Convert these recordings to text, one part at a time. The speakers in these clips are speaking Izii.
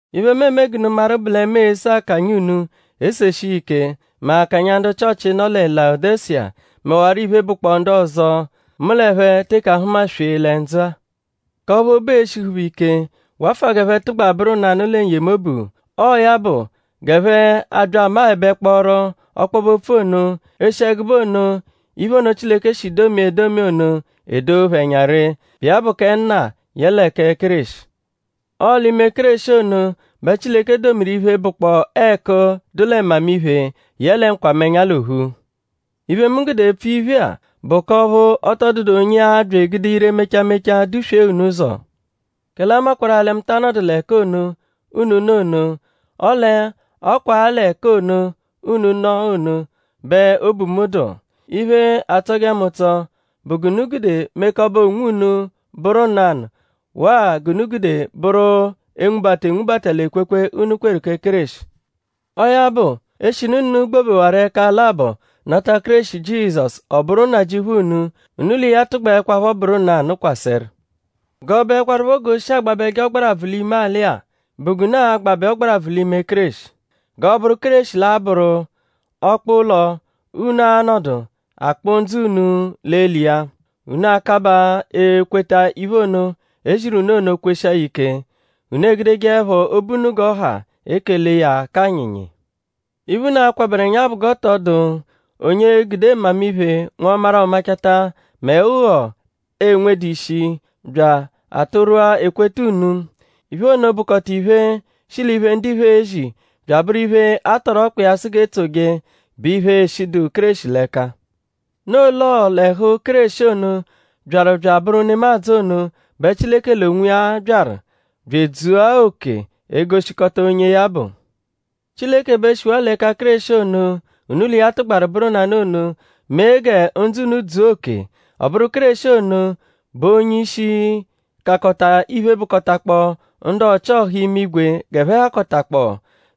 Iphe, mu eme g'unu maru bụ lẹ mu ese akanya unu eseshi iya ike; mẹ akanya ndu Chịochi, nọ lẹ Layodeshiya; mẹwaro iphe, bụkpoo ndu ọzo, mu l'ẹphe teke ahụma-swee lẹ ndzụ-a. K'ọphu obu e-shihu phẹ ike; wafụa g'ẹphe tụgba bụru nanụ lẹ n-yemobu; ọo ya bụ g'ẹphe abya amaẹbekporu ọkpobe-opfu ono; e-shi ẹgube ono iphe ono, Chileke shi domia edomi ono edoo phẹ ẹnya ree, bụ iya bụ kẹ Nna yẹle kẹ Kéreshi. Ọo l'ime Kéreshi ono bẹ Chileke domiru iphe, bụkpoo ẹku, dụ lẹ mmamiphe yẹle nkwamẹnya l'ophu. Iphe, mu gude epfu iphe-a bụ k'ọphu ọ tọ dụdu onye a-bya egude ire mecha mecha duswee unu ụzo. Kẹle a makwarụ-a lẹ mu ta anọdu l'ẹka ono, unu nọ ono; ọle ọ kwa-a l'ẹka ono, unu nọ ono bẹ obu mu dụ. Iphe, atsọje mu ụtso bụ g'unu gude mekọbe onwunu bụru nanụ waa g'unu gude bụru enwubata enwubata l'ekwekwe, unu kweru kẹ Kéreshi. Ọo ya bụ; eshinu unu gbobewaru ẹka labọ nata Kéreshi Jizọsu ọ bụru Nnajịuphu unu; unu l'iya tụgbaekwapho bụru nanụ kwasẹru. G'ọ bụekwarupho g'oshi agbabẹje ọgbarabvu l'ime alị-a bụ g'unu a-gbabẹ ọgbarabvu l'ime Kéreshi. G'ọ bụru Kéreshi bẹ l'a-bụru ọkpa-ụlo, unu a-nọdu akpụ ndzụ unu l'eli iya. Unu akabaa ekweta iphe ono, e ziru unu ono kweshia ya ike. Unu egudejeẹpho obu unu g'ọ ha ekele iya k'anyịnyi. Iphe, unu akwabẹru ẹnya bụ g'ọ tọ dụ onye e-gude mmamiphe nwọmaru-ọ-machata mẹ ụgho, enwedu ishi bya atụrwua ekweta unu. Iphe ono bụkota iphe, shi l'iphe, ndiphe ezi; bya abụru iphe, a tọru ọkpa iya sụ g'e tsoje, bụ iphe, eshidu Kéreshi l'ẹka. Noo l'ọo l'ẹhu Kéreshi ono, byaru bya abụru nemadzụ ono bẹ Chileke l'onwiya byaru bya edzua oke egoshikọta onye ya bụ. Chileke bẹ shiwaa l'ẹka Kéreshi ono, unu l'iya tụgbaru bụru nanụ ono mee gẹ ndzụ unu dzua oke. Ọ bụru Kéreshi ono bụ onye-ishi, kakọta iphe, bụkotakpoo ndu ọchi-ọha imigwe g'ẹphe hakọtakpoo;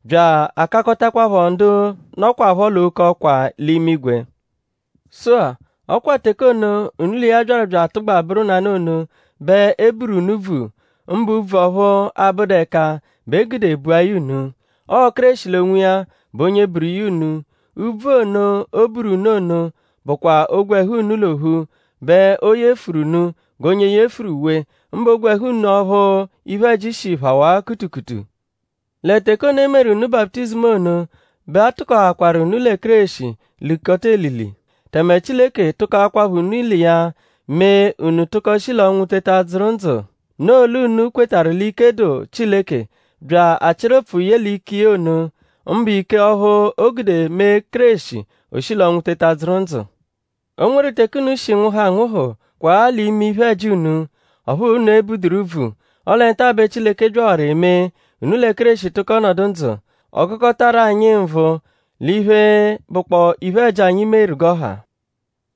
bya akakọtakwapho ndu nọkwapho l'oke ọkwa l'imigwe. Sụ-a; ọ kwa teke ono, unu l'iya byaru bya atụgba bụru nanụ ono bẹ e buru unu úbvù; mbụ úbvù ọphu abụdu ẹka bẹ e gude bua ya unu. Ọo Kéreshi l'onwiya bụ onye buru iya unu. Úbvù ono, o buru unu ono bụkwa ogwẹhu unu l'ophu bẹ o yefuru unu g'onye yefuru uwe; mbụ ogwẹhu unu ọphu iphe-ẹji shi phawaa kutukutu. Lẹ teke ono, e meru unu baputizimu ono bẹ a tụkoakwaru unu lẹ Kéreshi likọta elili. Tẹme Chileke tụkokwapho unu l'iya mee unu tụko shi l'ọnwu teta dzụru ndzụ. Noo l'unu kwetarụ l'ike dụ Chileke bya achịru ụpfu ye l'ike iya ono; mbụ ike ọphu, o gude mee Kéreshi o shi l'ọnwu teta dzụru ndzụ. O nweru teke unu shi nwụhu anwụhu kwaa l'ime iphe-ẹji unu; ọphu unu ebuduru úbvù; ọle nta bẹ Chileke byawarụ emee; unu lẹ Kéreshi tụko nọdu ndzụ; ọ gụkotaru anyi nvụ l'iphe, bụkpoo iphe-ẹji, anyi meru g'ọ ha.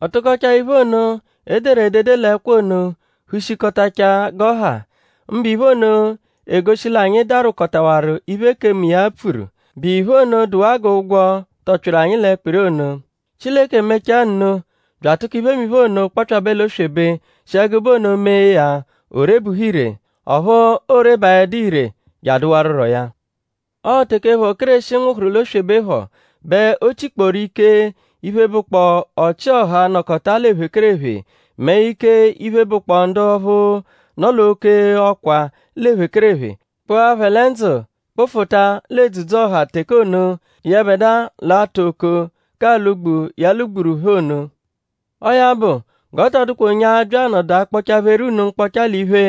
Ọ tụkochaa iphe ono, e deru edede l'ẹkwo ono hushikọtachaa g'ọ ha; mbụ iphe ono, egoshi l'anyi darwụkotawaru iphe, ekemu iya pfuru, bụ iphe ono dụwaa g'ụgwo, tọpyitaru anyi l'ẹkpiri ono. Chileke mechaa nno bya atụko iphemiphe ono kpọpyabe l'oswebe shi ẹgube ono mee ya o rebuhu ire. Ọphu oo-rebaẹdu ire je adụwaruro ya. Ọo teke phọ, Kéreshi nwụhuru l'oswebe phọ bẹ o chikpọru ike iphe, bụkpoo ọchi-ọha, nọkota l'ephekerephe; mẹ ike iphe, bụkpoo ndu ọphu nọ l'oke ọkwa l'ephekerephe; kpụa phẹ lẹ ndzụ kpụfuta l'edzudzu-ọha teke ono, yẹbedua l'atụ okoo k'alwụ-gbu, ya lwụ-gburu phẹ ono. Ọo ya bụ; g'ọ tọ dụkwa onye a-bya anọdu akpọcha-pheru unu mkpọcha l'iphe,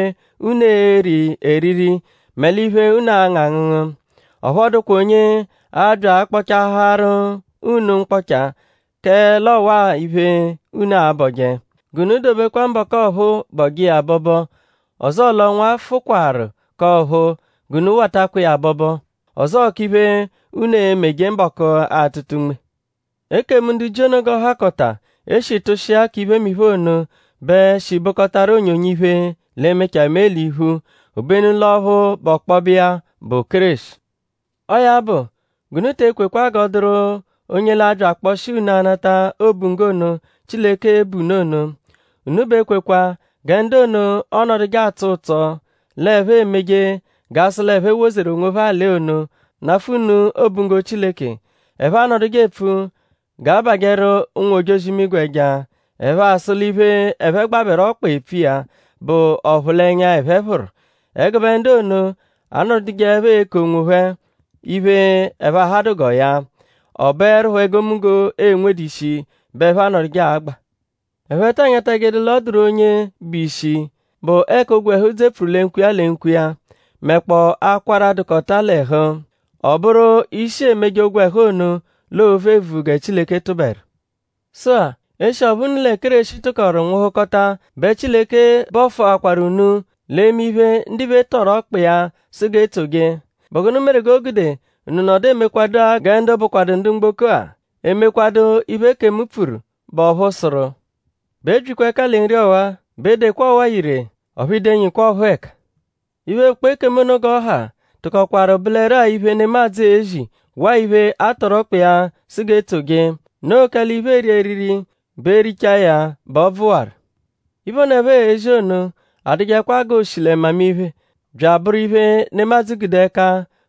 unu eri eriri mẹ l'iphe, unu angụ angụngu. Ọphu ọ dụkwa onye a-bya akpọchaaharu unu mkpọcha kẹ l'ọwaa iphe, unu abọje; g'unu dobekwa mbọku ọphuu bọje iya abọbo; ọzoo l'ọnwa fụkwaru k'ọ̀phúú g'unu watakwa iya abọbo; ọzoo k'iphe, unu e-meje mbọku atụta unme. Ekemu ndu Jiu ono g'ọ hakọta, e shi tụshia k'iphemiphe ono bẹ shi bụkotaru onyonyo iphe, l'e-mechaa mee l'iphu. Obenu l'ọphu bụ ọkpobe iya bụ Kéreshi. Ọo ya bụ g'unu te ekwekwa g'ọ dụru onye l'abya akpọshia unu anata obunggo ono, Chileke l'e-bu unu ono. Unu b'ekwekwa gẹ ndu ono, ọonoduje atsọ ụtso l'ẹphe emeje g'a sụ l'ẹphe wozeru onwophẹ alị ono nafụ unu obunggo Chileke. Ẹphe anọduje epfu g'a bajẹru ụnwu-ojozi-imigwe ẹja; ẹphe asụ l'iphe, ẹphe gbabẹru ọkpa epfu iya bụ ọphulenya, ẹphe phụru. Ẹgube ndu ono anọdujeepho eku onwophẹ iphe, ẹphe ahadụ g'ọo ya. Ọ bụerupho egomunggo, enwedu ishi bẹ ẹphe anọduje agba. Ẹphe ta anyatajẹedu l'ọ dụru onye bụ ishi, bụ ẹka ogwẹhu dzepfuru lẹ nkwo iya lẹ nkwo iya; mẹkpoo akwara, dụkota l'ẹhu. Ọ bụru ishi emeje ogwẹhu ono l'oovu evuvu gẹ Chileke tụberu. Sụ-a; eshi ọphu unu lẹ Kéreshi tụkoru nwụhukota bẹ Chileke bọfuakwaru unu l'eme iphe, ndiphe tọru ọkpa iya, sụ g'e tsoje.?Bụ gụnu meru g'o gude unu nọdu emekwadua gẹ ndu bụkwadu ndu mgboko-a; emekwadu iphe, ekemu pfuru, bụ ọphu sụru: “B'ebyikwa ẹka lẹ nri ọwa! B'edekwa ọwa-a ire; ọphu i denyikwa ọphuu ẹka?” Iphe, bụkpoo ekemu ono g'ọ ha tụkokwaru bụleru-a iphe, nemadzụ ezi waa iphe, a tọru ọkpa iya sụ g'etsoje. Noo kẹle iphe, eeri eriri bụ e -richawa iya bẹ ọ bvụwaru. Iphe ono, ẹphe ezi ono adụjekwa g'o shi lẹ mmamiphe; bya abụru iphe, nemadzụ gude ẹka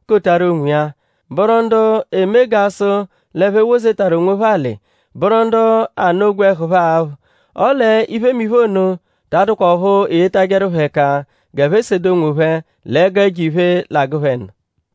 kotaru onwiya; bụru ndu eme g'a sụ l'ẹphe wozetaru onwophẹ alị; bụru ndu anụ ogwẹhu phẹ aphụ. Ọle iphemiphe ono ta adụkwa ọphu eyetajẹru phẹ ẹka g'ẹphe sede onwophẹ l'ẹgu ẹjo-iphe, l'agụ phẹ nụ.